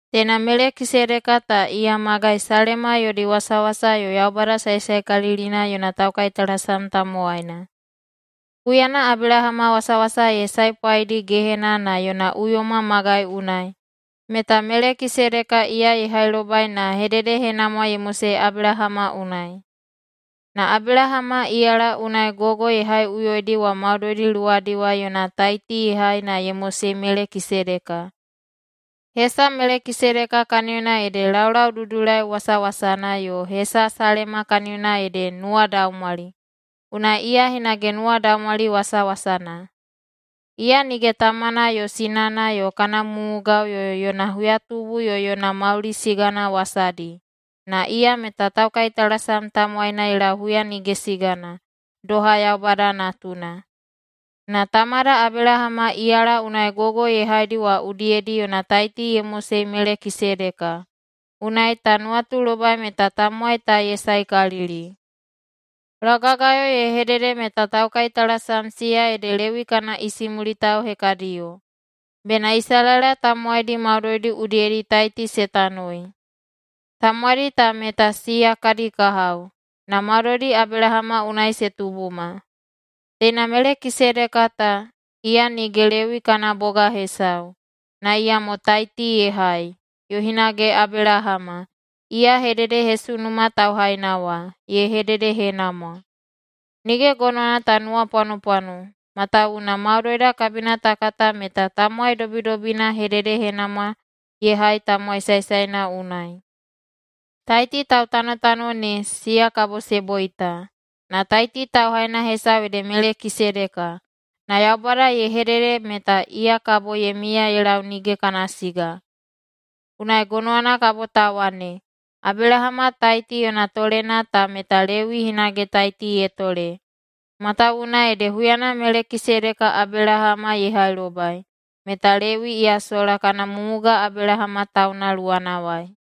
Teina Melekisedeka ta iya magai Salema yodi wasawasa yo Yaubada Saesaekalilina yona taukaitalasam tamowaina. Huyana Abelahama wasawasa ye saepwaidi gehena na yona uyoma magai unai, meta Melekisedeka iya ye hailobai na hededehenamwa ye mosei Abelahama unai. Na Abelahama iyala unai gogo ye haiꞌuyoidi wa maudoidi luwadiwai yona taiti ye hai na ye mosei Melekisedeka. Hesa Melekisedeka kaniyona ede laulaududulai wasawasana, yo hesa Salema kaniyona ede nuwadaumwali, unai iya hinage “nuwadaumwali wasawasana”. Iya nige tamana yo sinana yo kana mumugao yo yona huyatubu yo yona mauli sigana wasadi, na iya meta taukaitalasam tamowaina ye lau huya nige sigana, doha Yaubada Natuna. Na tamada Abelahama iyala unai gogo ye haidi wa udiyedi yona taiti ye mosei Melekisedeka, unai ta nuwatulobai meta tamowai ta ye saekalili. Laugagayo ye hedede meta taukaitalasam siya ede Lewi kana isimulitao hekadiyo, bena Isalaela tamowaidi maudoidi udiyedi taiti se tanoi. Tamowaidi ta meta siya kadi kahao, na maudoidi Abelahama unai se tubuma. Teina Melekisedeka ta, iya nige Lewi kana boga hesau, na iyamo taiti ye hai, yo hinage Abelahama, iya hededehesunuma tauhaina wa, ye hededehenamwa. Nige gonowana ta nuwapwanopwano, matawuwuna maudoida kabina ta kata meta tamowai dobidobina hededehenamwa ye hai tamowai saesaena unai. Taiti tautanotano ne, siya kabo se boita. Na taiti tauhaina hesau ede Melekisedeka, na Yaubada ye hedehedede meta iya kabo ye miya ye lau nige kana siga. Unai gonowana kabo ta wane, Abelahama taiti yona tolena ta meta Lewi hinage taiti ye tole, matawuwuna ede huyana Melekisedeka Abelahama ye hailobai, meta Lewi iya sola kana mumuga Abelahama tauna luwanawai.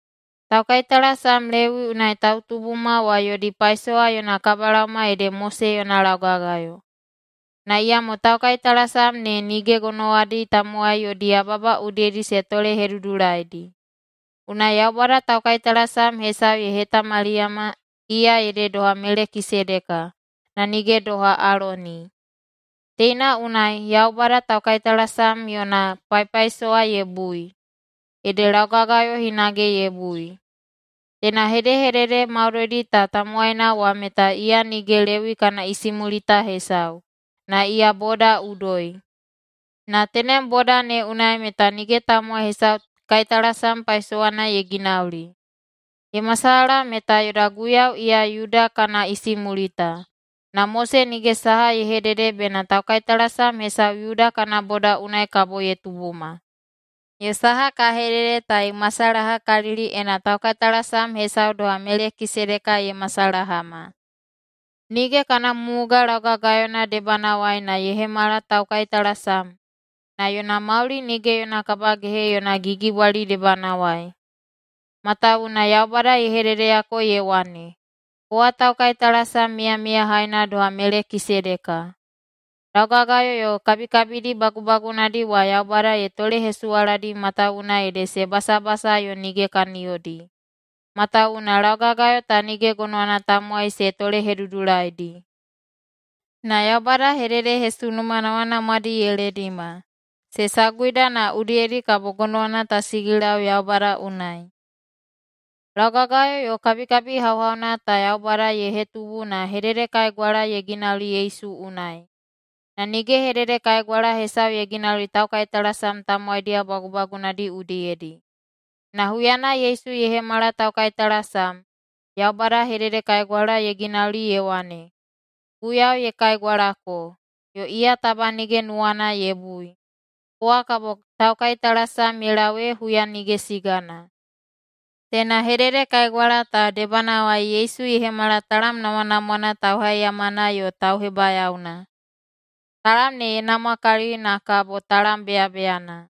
Taukaitalasam Lewi unai tautubuma wa yodi paisowa yona kabalaoma ede Mose yona laugagayo. Na iyamo taukaitalasam ne nige gonowadi tamowai yodi yababa udiyedi se tolehedudulaidi. Unai Yaubada taukaitalasam hesau ye hetamaliyama, iya ede doha Melekisedeka, na nige doha Aloni. Teina unai Yaubada taukaitalasam yona paipaisowa ye bui, ede laugagayo hinage ye bui. Teina hedehedede maudoidi ta tamowaina wa meta iya nige Lewi kana isimulita hesau, na iya boda udoi. Na tenem boda ne unai meta nige tamowai hesau kaitalasam paisowana ye ginauli. Ye masalaha meta yoda Guiyau iya Yuda kana isimulita, na Mose nige saha ye hedede bena taukaitalasam hesau Yuda kana boda unai kabo ye tubuma. Yo saha ka hedede ta ye masalahakalili, ena taukaitalasam hesau doha Melekisedeka ye masalahama. Nige kana mumuga laugagayona debanawai na ye hemala taukaitalasam, na yona mauli nige yona kabagehe yona gigibwali debanawai. Matawuwuna Yaubada ye hededeyako ye wane, “Kowa taukaitalasam miyamiyahaina doha Melekisedeka.” Laugagayo yo kabikabidi bagubagunadi wa Yaubada ye tolehesuwaladi matawuwuna ede se basabasa yo nige kaniyodi, matawuwuna laugagayo ta nige gonowana tamowai se tolehedudulaidi. Na Yaubada hededehesunuma namwanamwadi ye ledima, se saguida na udiyedi kabo gonowana ta sigilau Yaubada unai. Laugagayo yo kabikabi hauhauna ta Yaubada ye hetubu na hededekaigwala ye ginauli Yesu unai. Na nige hededekaigwala hesau ye ginauli taukaitalasam tamowaidiyao bagubagunadi udiyedi. Na huyana Yesu ye hemala taukaitalasam, Yaubada hededekaigwala ye ginauli ye wane, “Guiyau ye kaigwalako, yo iya taba nige nuwana ye bui: Kowa kabo taukaitalasam ye lau ee huya nige sigana” Teina hededekaigwala ta debanawai Yesu ye hemala talam namwanamwana tauhaiyamana yo tauhebayaona. Talam ne ye namwakalili na kabo talam beyabeyana.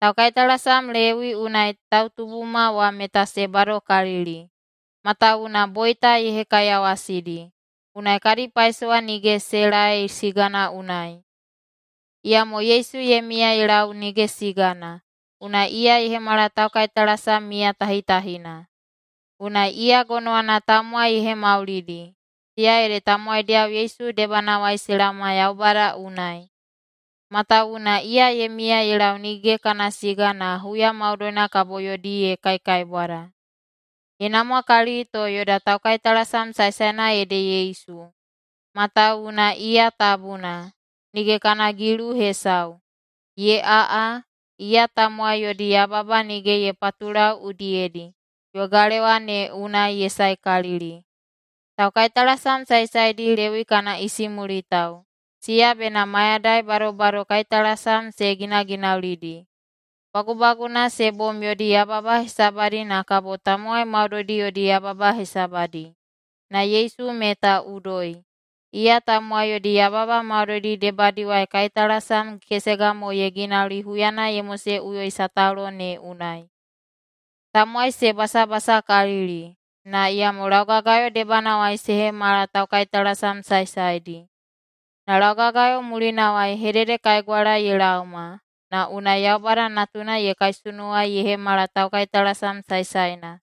Taukaitalasam Lewi unai tautubuma wa meta se badokalili, matawuwuna boita ye hekaiyawasidi, unai kadi paisowa nige se laei sigana unai. Iyamo Yesu ye miya ye lau nige sigana, unai iya ye hemala taukaitalasam miyatahitahina. Unai iya gonowana tamowai ye hemaulidi, siya ede tamowaidiyao Yesu debanawai se laoma Yaubada unai. Matawuwuna iya ye miya ye lau nige kana siga na huya maudoina kabo yodi ye kaikaibwada. Ye namwakalili to yoda taukaitalasam saesaena ede Yesu, matawuwuna iya tabuna, nige kana gilu hesau, ye aꞌa, iya tamowai yodi yababa nige ye patulau udiyedi, yo galewa ne unai ye saekalili. Taukaitalasam saesaedi Lewi kana isimulitao, siya bena mayadai badobado kaitalasam se ginaginaulidi, bagubaguna se bom yodi yababa hesabadi na kabo tamowai maudoidi yodi yababa hesabadi. Na Yesu meta udoi. Iya tamowai yodi yababa maudoidi debadiwai kaitalasam kesega mo ye ginauli huyana ye moseꞌuyoi sataulo ne unai. Tamowai se basabasakalili, na iyamo laugagayo debanawai se hemala taukaitalasam saesaedi. Na laugagayo mulinawai hededekaigwala ye laoma, na unai Yaubada Natuna ye kaisunuwai ye hemala taukaitalasam saesaena.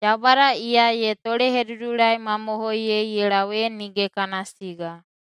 Yaubada iya ye tolehedudulaimamohoiyei ye lau ee nige kana siga.